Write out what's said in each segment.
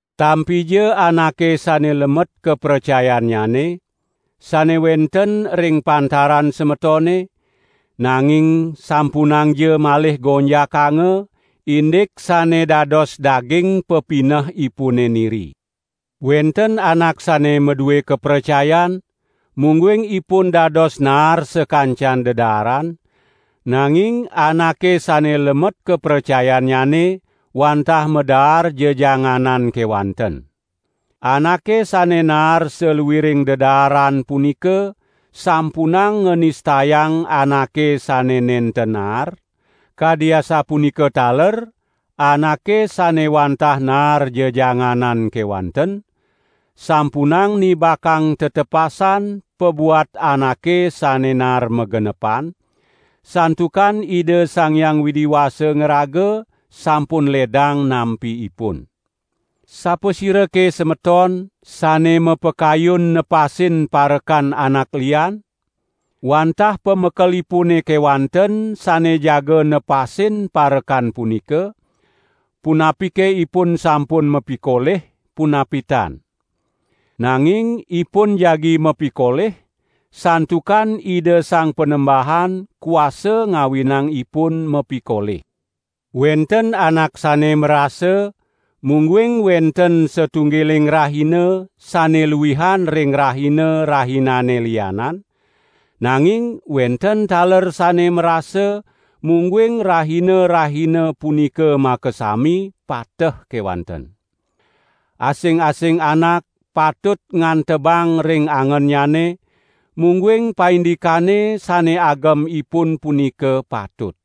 Tampija anake sane lemet kapracayannyane, sane wenten ring pantaran semetone, nanging sampunangja malih gonjakanga, indik sane dados daging pepinehipune niri. Wenten anak sane madue kapracayan, mungguing ipun dados naar sakancan dedaaran, nanging anake sane lemet kapracayannyane wantah madaar jejanganan kewanten. Anake sane naar saluiring dedaaran punika sampunang nganistayang anake sane nenten naar; kadi asapunika taler anake sane wantah naar jejanganan kewanten, sampunang nibakang tetepasan pabuat anake sane naar magenepan, santukan Ida Sang Hyang Widi Wasa ngraga sampun ledang nampi ipun. Sapasirake semeton, sane mapakayun nepasin parekan anak lian? Wantah pamekelipune kewanten sane jaga nepasin parekan punika, punapike ipun sampun mapikolih, punapi tan. Nanging ipun jagi mapikolih, santukan Ida Sang Panembahan kuasa ngawinang ipun mapikolih. Wenten anak sane marasa, mungguing wenten satunggiling rahina sane luihan ring rahina-rahinane lianan, nanging wenten taler sane marasa mungguing rahina-rahina punika makasami pateh kewanten. Asing-asing anak patut ngantebang ring angennyane, mungguing paindikane sane agem ipun punika patut.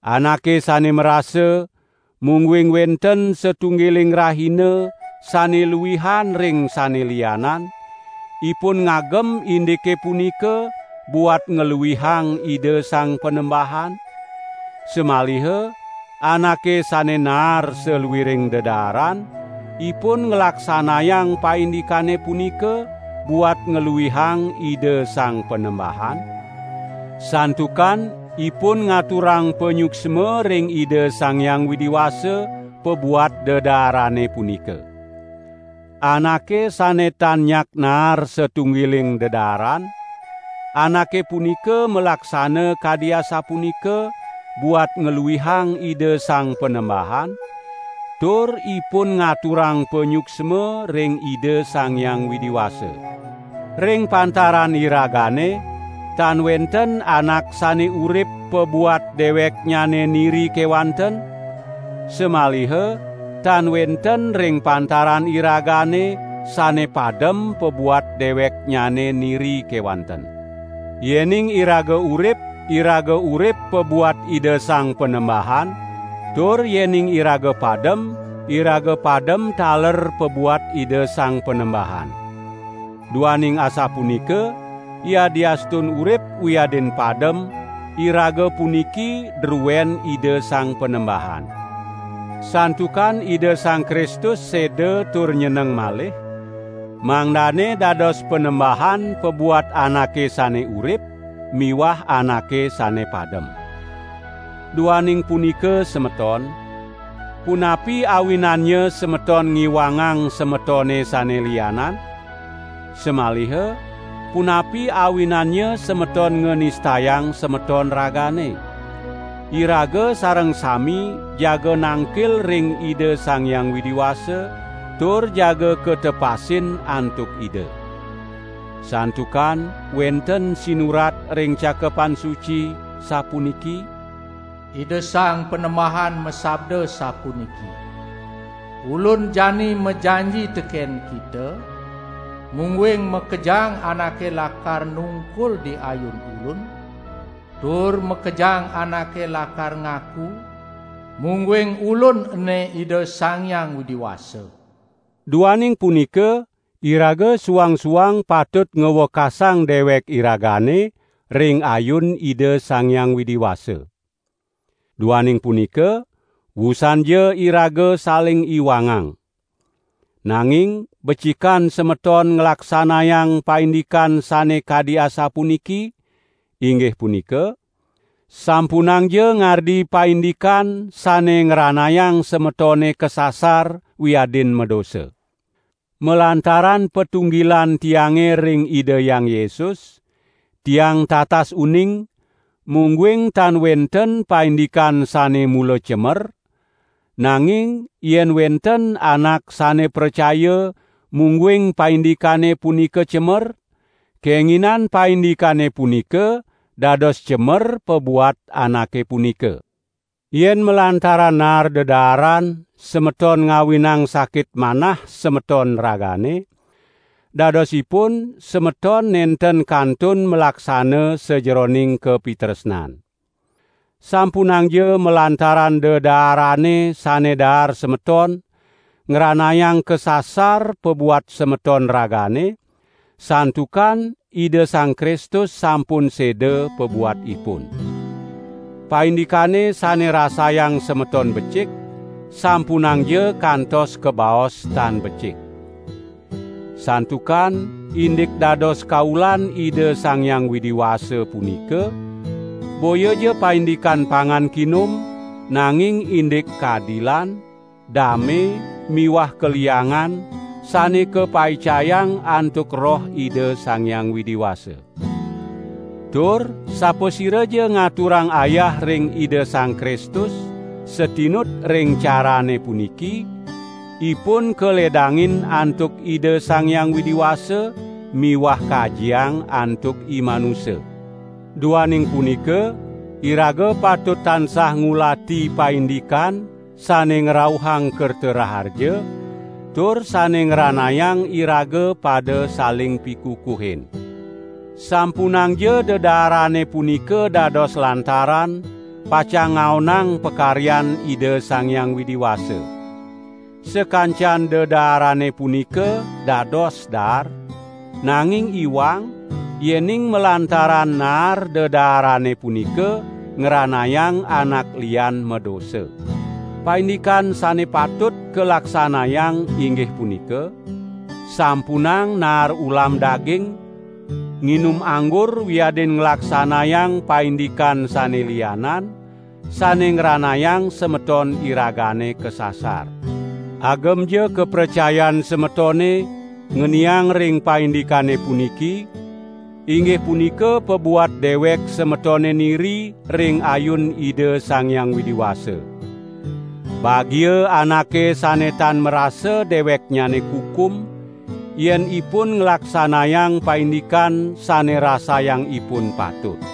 Anake sane marasa, mungguing wenten satunggiling rahina sane luihan ring sane lianan, ipun ngagem indike punika buat ngluihang Ida Sang Panembahan; samaliha anake sane naar saluiring dedaaran, ipun nglaksanayang paindikane punika buat ngluihang Ida Sang Panembahan; santukan ipun ngaturang panyuksma ring Ida Sang Hyang Widi Wasa pabuat dedaarane punika. Anake sane tan nyak naar satunggiling dedaaran, anake punika malaksana kadi asapunika buat ngluihang Ida Sang Panembahan, tur ipun ngaturang panyuksma ring Ida Sang Hyang Widi Wasa. Ring pantaran iragane tan wenten anak sane urip pabuat deweknyane niri kewanten; samaliha tan wenten ring pantaran iragane sane padem pabuat deweknyane niri kewanten. Yening iraga urip, iraga urip pabuat Ida Sang Panembahan; tur yening iraga padem, iraga padem taler pabuat Ida Sang Panembahan. Duaning asapunika, yadiastun urip wiadin padem, iraga puniki druen Ida Sang Panembahan. Santukan Ida Sang Kristus seda tur nyeneng malih, mangdane dados Panembahan pabuat anake sane urip miwah anake sane padem. Duaning punika semeton, punapi awinannya semeton ngiwangang semetone sane lianan? Samaliha, punapi awinannya semeton nganistayang semeton ragane? Iraga sareng sami jaga nangkil ring Ida Sang Hyang Widi Wasa, tur jaga katepasin antuk Ida. Santukan wenten sinurat ring Cakepan Suci, sapuniki: "Ida Sang Panembahan masabda sapuniki: 'Ulun jani majanji teken kita, mungguing makejang anake lakar nungkul di ayun Ulun, tur makejang anake lakar ngaku, mungguing Ulun ene Ida Sang Hyang Widi Wasa." Duaning punika, iraga suang-suang patut ngwekasang dewek iragane ring ayun Ida Sang Hyang Widi Wasa. Duaning punika, wusanja iraga saling iwangang. Nanging becikan semeton nglaksanayang paindikan sane kadi asapuniki, inggih punika: Sampunangja ngardi paindikan sane ngranayang semetone kasasar wiadin madosa. Malantaran patunggilan tiange ring Ida Hyang Yesus, tiang tatas uning, mungguing tan wenten paindikan sane mula cemer; nanging yen wenten anak sane pracaya mungguing paindikane punika cemer, kenginan paindikane punika dados cemer pabuat anake punika. Yen malantaran naar dedaaran, semeton ngawinang sakit manah semeton ragane, dadosipun semeton nenten kantun malaksana sajeroning kapitresnan. Sampunangja malantaran dedaarane sane daar semeton, ngranayang kasasar pabuat semeton ragane, santukan Ida Sang Kristus sampun seda pabuat ipun. Paindikane sane rasayang semeton becik, sampunangja kantos kabaos tan becik. Santukan indik dados kaulan Ida Sang Hyang Widi Wasa punika, boyaja paindikan pangan kinum, nanging indik kadilan, dame miwah kaliangan sane kapaicayang antuk Roh Ida Sang Hyang Widi Wasa. Tur sapasiraja ngaturang ayah ring Ida Sang Kristus satinut ring carane puniki, ipun kaledangin antuk Ida Sang Hyang Widi Wasa miwah kajiang antuk imanusa. Duaning punika, iraga patut tansah ngulati paindikan sane ngrauhang kerta raharja, tur sane ngranayang iraga pada saling pikukuhin. Sampunangja dedaarane punika dados lantaran pacang ngaonang pakaryan Ida Sang Hyang Widi Wasa. Sakancan dedaarane punika dados daar, nanging iwang, yening malantaran naar dedaarane punika ngranayang anak lian madosa. Paindikan sane patut kalaksanayang inggih punika: Sampunang naar ulam daging, nginum anggur wiadin nglaksanayang paindikan sane lianan, sane ngranayang semeton iragane kasasar. Agemja kapracayan semetone ngeniang ring paindikane puniki, inggih punika pabuat dewek semetone niri ring ayun Ida Sang Hyang Widi Wasa. Bagia anake sane tan marasa deweknyane kukum, yen ipun nglaksanayang paindikan sane rasayang ipun patut.